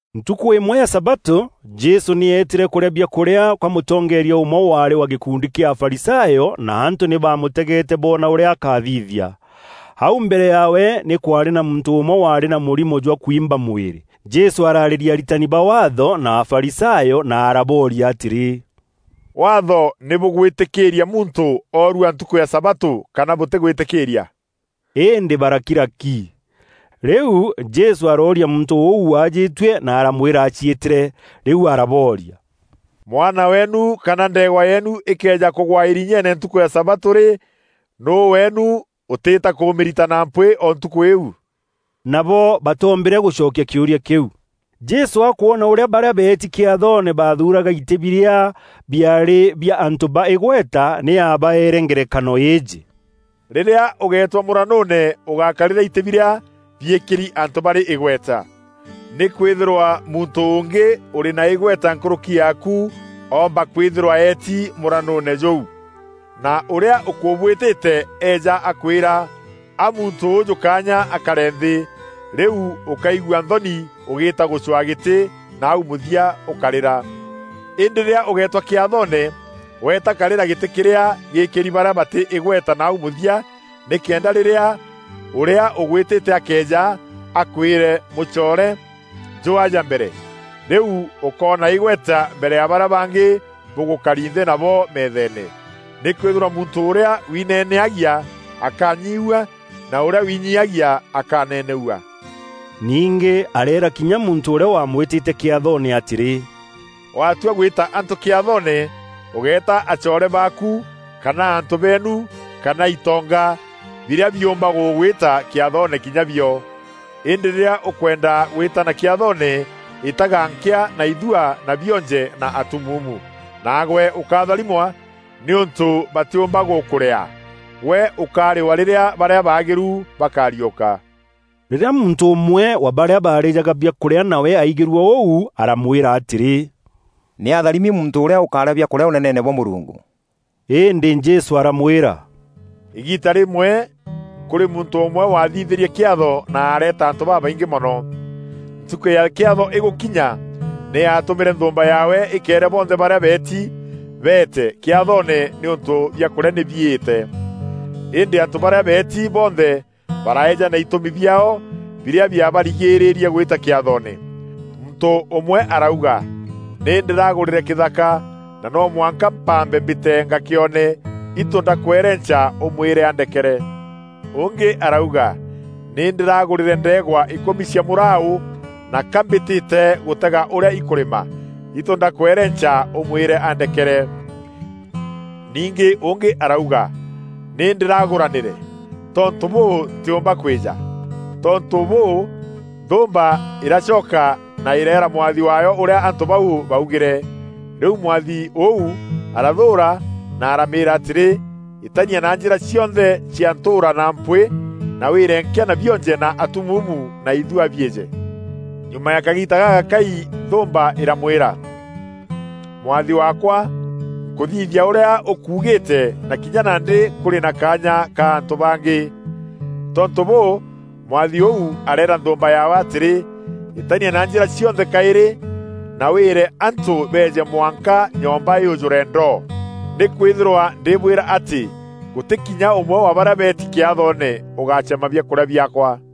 Ntukû îmwe ya sabatû Jesû nî eetîre kûrîa biakûrîa kwa mûtongeeria ûmwe waarî wa gîkundi kîa Afarisayo na antû nî baamûtegeete boona ûrîa akathithia. Au mbere yaawe nî kwaarî na muntû ûmwe waarî na mûrimo jwa kwimba mwîrî. Jesû araarîria aritani ba Waatho na Afarisayo na arabooria atîrî, “Waatho nî bûgwîtîkîîria muntû oorua ntukû ya sabatû kana bûtîgwîtîkîîria?” Îndî barakira ki. Rîu Jesû arooria muntû ûu waajîtue na aramwîra aciîtîre. Rîu arabooria, “Mwana weenu kana ndeegwa yeenu îkëeja kûgwa îrinyeene ntukû ya sabatû rî, nûû weenu, ûtîîta kûmîrita na mpwîî o ntukû îîu?” Nabo batoombîre gûcokia kîûria kîu. Jesû akwona ûrîa barîa beeti kîathoone baathuuraga itî birîa biarî bia antû ba îgweta, nî aabaeere ngerekano îîjî, “Rîrîa ûgeetwa mûranûûne ûgákarîra itî birîa biîkîri antû barî îgweta. Nîkwîthîrwa muntû ûngî ûrî na îgweta nkûrûki yaaku oomba kwîthîrwa eeti mûranûûne jûu, na ûrîa ûkûbwîtîte eeja akwîra, ‘Aa muntû ûûjû kaanya akare nthî.’ Rîu ûkaigua nthoni ûgîîta gûcwaa gîtî nau mûthia ûkarîra. Îndî rîrîa ûgeetwa kîathoone, weeta karîra gîtî kîrîa gîîkîri barîa batî îgweta nau mûthia nîkenda rîrîa ûrîa ûgwîtîte akeeja, akwîre, ‘Mûcoore, njûû aja mbere! Rîu ûkoona îgweta mbere ya barîa bangî bûgûkari nthî nabo meetheene. Nîkwîthîrwa muntû ûrîa wineneagia akanyiiua na ûrîa wiinyiiagia akaneneua.’” Ningî areera kinya muntû ûrîa waamwîtîte kîathoone atîrî, “Watua gwîta antû kîathoone, ûgéeta acoore baaku kana antû beenu kana itonga, birîa biûmba gûgwîta kîathoone kinya bio. Îndî rîrîa ûkwenda gwîtana kîathoone, îtaga nkîa na ithua na bionje na atumuumu, naagwe ûkaatharimwa, nîûntû batîûmba gûkûrîaa. Gwe ûkarîwa rîrîa barîa baagîru bakariûka.” Rîrîa muntû ûmwe wa barîa baarîjaga biakûrîa nawe aigîrue ûu, aramwîra atîrî, “Nî atharimi muntû ûrîa ûkarîa biakûrîa Ûneneene bwa Mûrungu!” Îndî Jesû aramwîra, “Îgiita rîmwe kûrî muntû ûmwe wathithîrie kîatho na areeta antû babaingî mono. Ntukû ya kîatho îgûkinya nî aatûmîre nthûûmba yaawe îkeere bonthe barîa beeti, ‘Beete kîathoone nîûntû biakûrîa nî biîte.’ Îndî antû barîa beeti bonthe baraeejana itûmi biaao birîa biabarigîrîrie gwîta kîathoone. Muntû ûmwe arauga, ‘Nî ndîragûrîre kîthaka na no mwanka mpambe mbîte ngakîone. Itû ndakwerenca ûmwîre andekere.’ Ûngî arauga, ‘Nî ndîragûrîre ndeegwa îkûmi cia mûraû, na ka mbîtîte gûtega ûrîa ikûrîma. Itû ndakwerenca ûmwîre andekere.’ Ningî ûngî arauga, ‘Nî ndîragûranîre. Tontû bûû, ntîûmba kwîja.’ Tontû bûû, nthûûmba îracoka na îreera mwathi waayo ûrîa antû bau baugîre. Rîu mwathi ûu arathûûra na aramîîra atîrî, ‘Îtania na njîra cionthe cia ntûûra na mpwîî na wîîre nkîa na bionje na atumuumu na ithua biîje.’ Nyuma ya kagiita gagakai nthûûmba îramwîra, ‘Mwathi waakwa, nkûthithia ûrîa ûkuugîîte na kinya nandî kûrî na kaanya ka antû bangî.’ Tontû bûû, mwathi ûu areera nthûûmba yaawe atîrî, ‘Îtania na njîra cionthe kaîrî na wîîre antû beeje mwanka nyomba yûjûre ndo. Nîkwîthîrwa ndîbwîra atî gûtî kinya ûmwe wa barîa beetî kîathoone ûgacema biakûrîa biaakwa.’”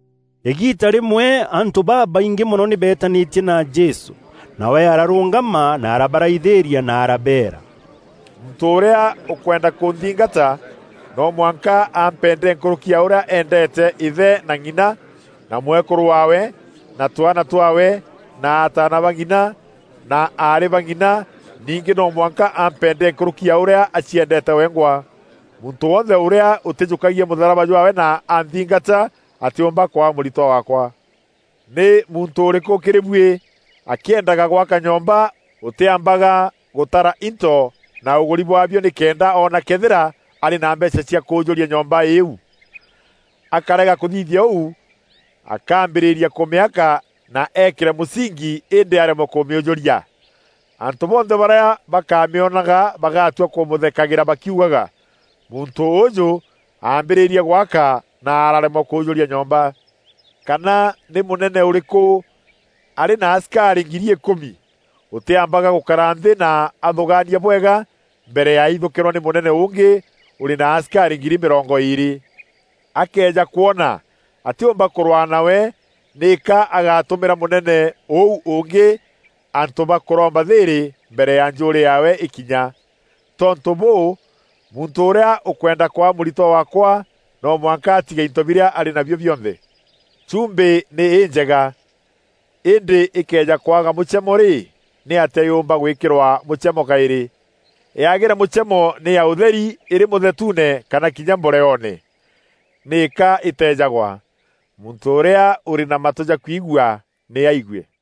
Îgiita rîmwe antû babaingî mono nî beetanîtie na Jesû. Nawe ararûngama na arabaraithîîria na arabeera, “Muntû ûrîa ûkwenda kûnthingata, no mwanka ampende nkûrûki ya ûrîa endete îthe na ng'ina, na mwekûrû waawe, na twaana twaawe, na ataana ba ng'ina, na aarî ba ng'ina; ningî no mwanka ampende nkûrûki ya ûrîa aciendeete wengwa. Muntû wonthe ûrîa ûtîjûkagia mûtharaba jwaawe na anthingata atîûmba kwaa mûritwa waakwa. Nî muntû ûrîkû kîrî buî akîendaga gwaka nyomba ûtîambaga gûtara into na ûgûri bwaabio nîkenda oona këethîra arî na mbeecha cia kûûjûria nyomba îîu? Akarega kûthithia ûu, akaambîrîria kûmîaka na eekîre mûsingi îndî aremwe kûmîûjûria. Antû bonthe barîa bakamîonaga bagatua kûmûthekagîra bakiugaga, ‘Muntû ûûjû aambîrîrie gwaka, na araremwa kûûjûria nyomba.’ Kana nî mûnene ûrîkû arî na asikarî ngiri îkûmi, ûtîambaga gûkara nthî na athûgaania bwega mbere ya aithûkîrwa nî mûnene ûngî ûrî na asikarî ngiri mîrongo îîrî? Akëeja kwona atîûmba kûrwaa nawe nîka agatûmîra mûnene ûu ûngî antû ba kûromba thîîrî mbere ya njûûrî yaawe îkinya. Tontû bûû, muntû ûrîa ûkwenda kwa mûritwa waakwa no mwanka atige into birîa arî nabio bionthe. “Chumbî nî înjega, îndî îkëeja kwaga mûchemo rî, nîatîa yûûmba gwîkîrwa mûchemo kaîrî? Yagîre mûchemo nî ya ûtherî îrî mûthetuune kana kinya mboreoone. Nîka îteejagwa. Muntû ûrîa ûrî na matû ja kwigua, nî aigue.”